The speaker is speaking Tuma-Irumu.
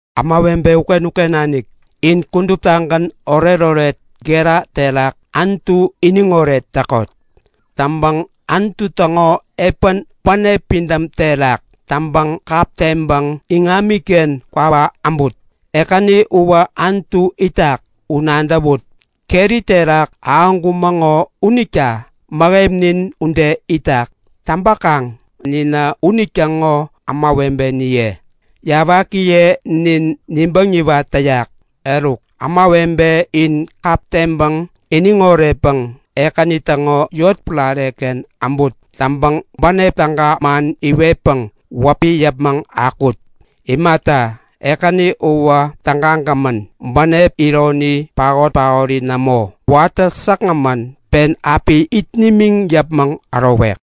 Ämawebe uken-uken nanik, in kuduptagän oretoret gera terak Anutu iniŋoret täkot! Täŋpäŋ Anutu täŋo epän bänep pidäm terak täŋpäŋ kap teŋpäŋ iŋamiken kwawak äbut. Ekäni uwä Anutu itak u nadäwut! Keri terak ahäŋkumäŋo unita mäheminin ude itak. Täŋpäkaŋ ninä unitäŋo ämawebeniye. Täŋkaŋ ninä yawakiye unita nibäŋ niwat täyak. Eruk ämawebe, in kap teŋpäŋ iniŋ oretpäŋ Ekäni täŋo yotpärareken äbut! Täŋpäŋ bänep täga man iwetpäŋ wäpi yäpmäŋ akuwut! Imata, Ekäni uwä tägagämän. Bänep ironi paot-paori nämo. Watä säkgämän pen api it nimiŋ yäpmäŋ ärowek.